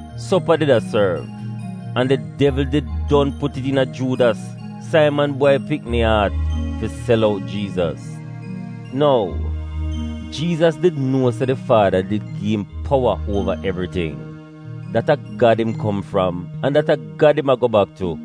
Sopa did a sorv, an di devl did don put it iina Juudas, Saiman bwai pikni, aat fi sel out Jiizas. Nou, Jiizas did nuo se di Faada did gi im powa uova evriting, dat a Gad im kom fram, an dat a Gad im a go bak tu,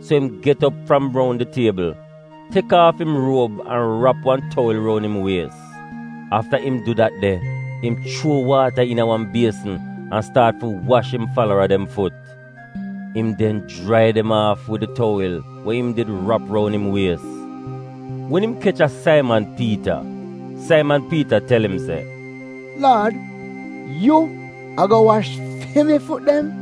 so im get op fram roun di tiebl, tek aaf im ruob an rap wan towil roun im wies. Afta im du dat de, im chuo waata iina wan biesn an staat fi wash im falara dem fut. Im den jrai dem aaf wid di towil we im did rap roun im wies. Wen im kech a Saiman Piita, Saiman Piita tel im se, “Laad, yu ago wash fi mi fut dem?”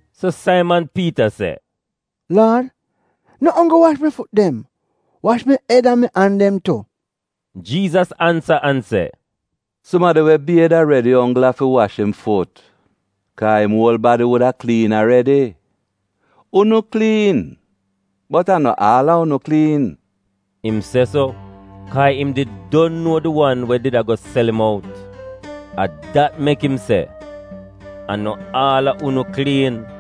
So Saiman Piita se, “Laad, no onggl wash mi fut dem! Wash mi ed an mi an dem tu!” Jiizas ansa an se, “Sumadi we bied aredi onggl afi wash im fut, kaa im uol badi wuda kliin aredi. Unu kliin, bot a no aal a unu kliin.” (Im se so, kaa im did don nuo di wan we did ago sel im out. A dat mek im se “A no aal a unu kliin”.)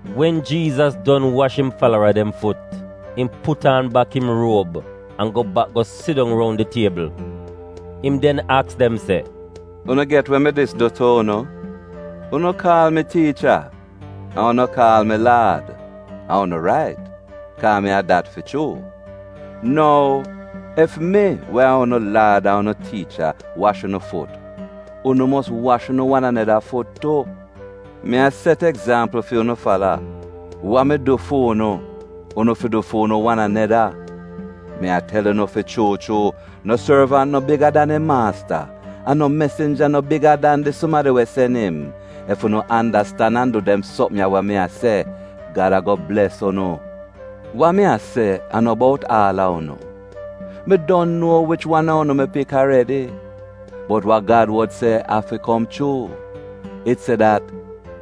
Wen Jiizas don wash im falara dem fut, im put aan bak im ruob an go bak go sidong roun di tiebl. Im den aks dem se, “Unu get we mi dis du tu unu? Unu kaal mi ‘Tiicha’ an unu kaal mi ‘Laad,’ an unu rait, kaa mi a dat fi chuu. Nou, ef mi, we a unu Laad an unu Tiicha, wash unu fut, unu mos wash unu wan aneda fut tu. Mi a set egzampl fi unu fala. Wa mi du fu'unu, unu fi du fu'unu wan aneda. Mi a tel unu fi chuu chuu, no sorvant no biga dan im maasta, an no mesinja no biga dan di sumadi we sen im. Ef unu andastan an du dem sopm ya wa mi a se, Gad ago bles unu. “Wa mi a se a no bout aal a unu. Mi don nuo wich wan a unu mi pik aredi. Bot wa Gad wod se afi kom chuu. It se dat,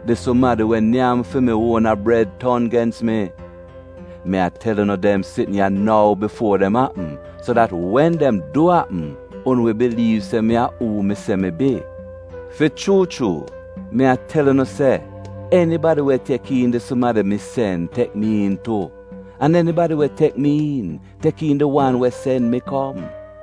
‘Di sumadi we nyam fi mi uona bred ton gens mi.’ Mi a tel unu dem sitn ya nou bifuo dem apm, so dat wen dem du apm, unu wi biliiv se mi a uu mi se mi bi. Fi chuu chuu mi a tel unu se, enibadi we tek iin di sumadi mi sen tek mi iin tu, an enibadi we tek mi iin tek iin di wan we sen mi kom.”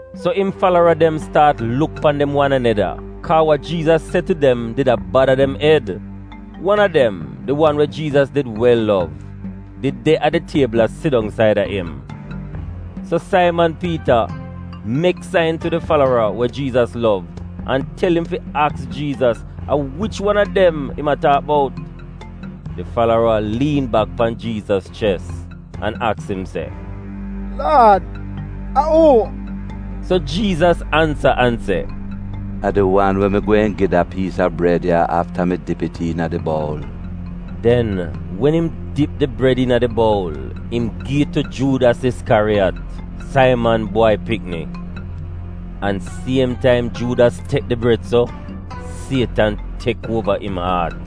So im falara dem staat luk pan dem wan aneda kaa wa Jiizas se tu dem did a bada dem ed. Wan a dem, di wan we Jiizas did wel lov, did de a di tiebl a sidong saida im. So Saiman Piita mek sain tu di falara we Jiizas lov an tel im fi aks Jiizas a wich wan a dem im a taak bout. Di falara liin bak pan Jiizas ches, an aks im se, “Laad, a uu?” So Jiizas ansa an se, “A di wan we mi gweehn gi da piis a bred ya afta mi dip it iina di boul.” Den, wen im dip di bred iina di boul im gi it tu Juudas Iskyariyat, Saiman bwai pikni. An siem az Juudas tek di bred so, Sietan tek uova im aat.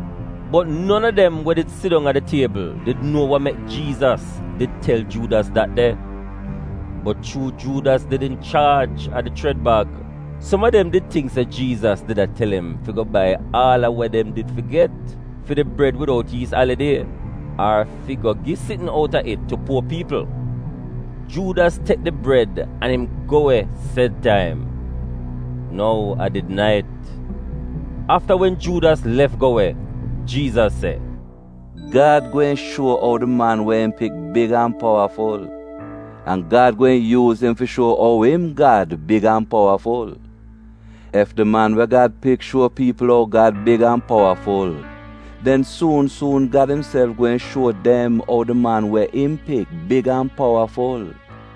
Bot non a dem we did sidong a di tiebl did nuo wa mek Jiizas did tel Juudas dat de. Bot chuu Juudas did inchaaj a di chred bag, som a dem did tingk se Jiizas did a tel im fi go bai aal a wa dem did fi get fi di Bred Widout Yiis Alidie, ar fi go gi sitn outa it tu puo piipl. Juudas tek di bred an im go we sed taim. (Nou, a did nait.) Afta wen Juudas lef go we, Jiizas se, “Gad gweehn shuo ou di Man we im Pik big an powaful, an Gad gweehn yuuz im fi shuo ou im Gad big an powaful. Ef di Man we Gad Pik shuo piipl ou Gad big an powaful, den suun suun Gad imself gweehn shuo dem ou di Man we im Pik big an powaful.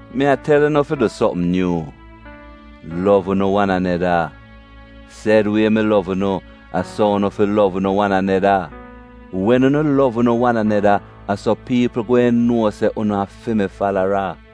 “Mi a tel unu fi du sopm nyuu — lov unu wan aneda. Sed wie mi lov unu, a so unu fi lov unu wan aneda. Wen unu lov unu wan aneda, a so piipl gweehn nuo se unu a fi mi falara.”